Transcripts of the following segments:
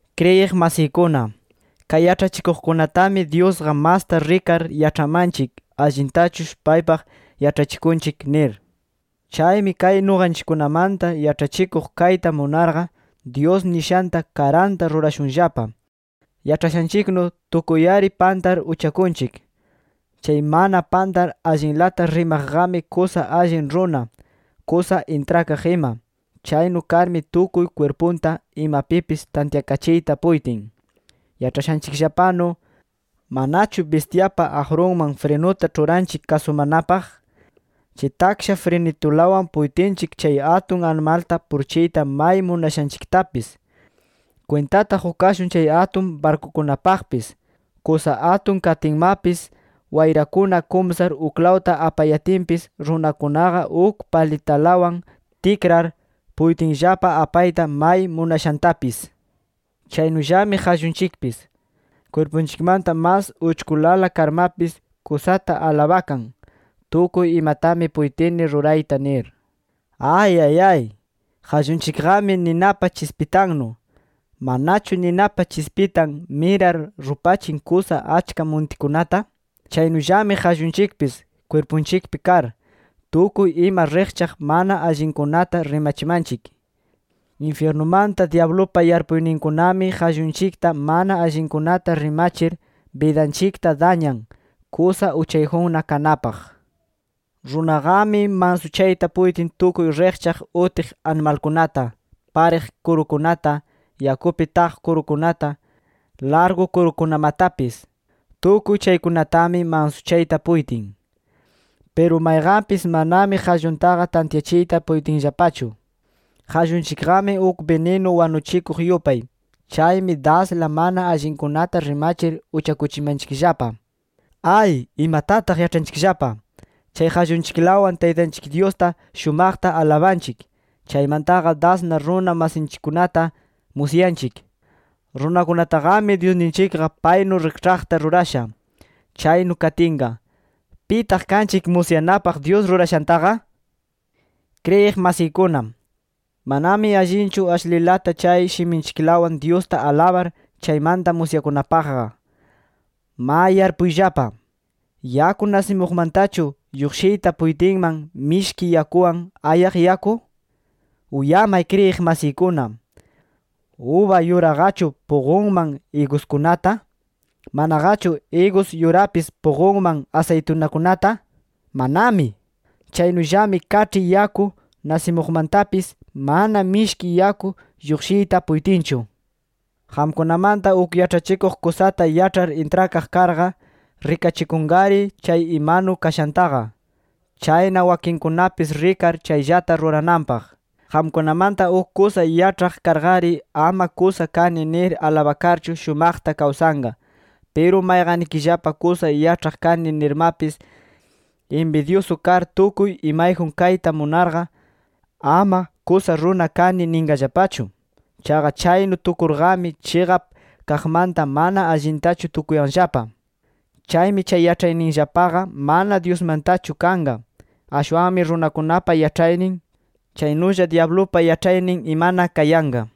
Kriyiq masiykuna, kay yaĉhachikuqkunatami Dyusqa masta rikar yaĉhamanchik allintachush paypaq yaĉhachikunchik nir. Chaymi kay nuqanchikkunamanta yaĉhachikuq kayta munarqa, Dyus nishanta karanta rurashunllapa. Yaĉhashanchiknu tukuy-ari pantar uchakunchik. Chay mana pantar allinlata rimaqqami kusa allin runa, kusa intrakaq ima. Chaynu karmi tukuy kwirpunta imapipis tantyakachiyta puytin. Yaĉhashanchikllapanu, ¿manachu bistyapa aqrunman frinuta ĉhuranchik kasumanapaq? Chay taksha frinitulawan puytinchik chay atun animalta purichiyta may munashanchiktapis. Kwintata qukashun chay atun barkukunapaqpis. Kusa atun katinmapis, wayrakuna kumsar uklawta apayatinpis, runakunaqa uk palitalawan tikrar, puytinllapa apayta may munashantapis. Chaynullami qallunchikpis. Kwirpunchikmanta mas uchkulala karmapis, kusata alabakan, “Tukuy imatami puytini rurayta” nir. ¡Ayayay! ¡Qallunchikqami ninapa chispitannu! ¿Manachu ninapa chispitan mirar rupachin kusa achka muntikunata? Chaynullami qallunchikpis, kwirpunchikpi kar, tukuy ima riqchaq mana allinkunata rimachimanchik. Infyirnumanta dyablupa yarpuyninkunami qallunchikta mana allinkunata rimachir, bidanchikta dañan, kusa uchayjunna kanapaq. Runaqami mansuchayta puytin tukuy riqchaq utiq animalkunata, pariq kurukunata, yakupi taq kurukunata, largu kurukunamatapis. Tukuy chaykunatami mansuchayta puytin. Piru mayqanpis manami qalluntaqa tantyachiyta puytinllapachu. Qallunchikqami uk bininu wanuchikuq yupay. Chaymi dasla mana allinkunata rimachir uchakuchimanchikllapa. ¡Ay imatataq yaĉhanchikllapa! Chay qallunchiklawan Taytanchik Dyusta shumaqta alabanchik. Chaymantaqa dasna runa masinchikkunata musyanchik. Runakunataqami Dyusninchikqa paynu rikĉhaqta rurasha. Chaynu katinqa, ¿pitaq kanchik musyanapaq Dyus rurashantaqa? Kriyiq masiykuna, manami allinchu ashlilata chay shiminchiklawan Dyusta alabar, chaymanta musyakunapaqqa. Ma, yarpuyllapa. ¿Yaku nasimuqmantachu lluqshiyta puytinman mishki yakuwan, ayaq yaku? Uyamay kriyiq masiykuna, ¿uba yuraqachu puqunman iguskunata? ¿Manaqachu igus yurapis puqunman asaytunakunata? ¡Manami! Chaynullami kaĉhi yaku nasimuqmantapis, mana mishki yaku lluqshiyta puytinchu. Qamkunamanta uk yaĉhachikuq kusata yaĉhar intrakaq karqa, rikachikunqari chay imanu kashantaqa. Chayna wakinkunapis rikar chayllata rurananpaq. Qamkunamanta uk kusa yaĉhaq karqari, ama kusa kani nir alabakarchu shumaqta kawsanqa. Piru mayqannikillapa kusa yaĉhaq kani nirmapis, inbidyusu kar tukuy imayjun kayta munarqa, ama “Kusa runa kani” ninqallapachu. Chaqa chaynu tukurqami chiqap kaqmanta mana allintachu tukuyanllapa. Chaymi chay yaĉhayninllapaqa, mana Dyusmantachu kanqa. Ashwanmi runakunapa yaĉhaynin, chaynulla dyablupa yaĉhaynin imana kayanqa.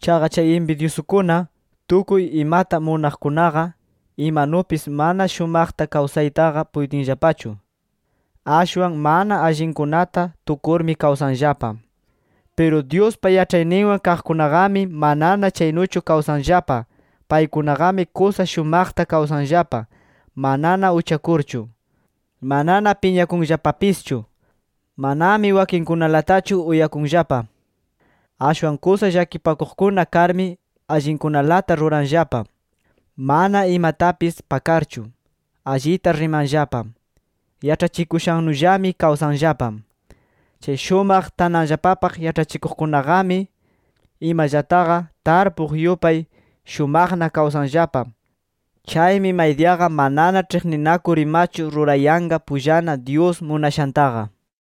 Chaqa chay inbidyusukuna, tukuy imata munaqkunaqa, imanupis mana shumaqta kawsaytaqa puytinllapachu. Ashwan mana allinkunata tukurmi kawsanllapa. Piru Dyuspa yaĉhayninwan kaqkunaqami manana chaynuchu kawsanllapa. Paykunaqami kusa shumaqta kawsanllapa, manana uchakurchu. Manana piñakunllapapischu. Manami wakinkunalatachu uyakunllapa. Ashwan kusa llakipakuqkuna karmi, allinkunalata ruranllapa. Mana imatapis pakarchu, allita rimanllapa. Yaĉhachikushannullami kawsanllapa. Chay shumaq tananllapapaq yaĉhachikuqkunaqami, imallataqa tarpuq yupay, shumaqna kawsanllapa. Chaymi maydiyaqa manana ĉhiqninakur imachu rurayanqa pullana Dyus munashantaqa.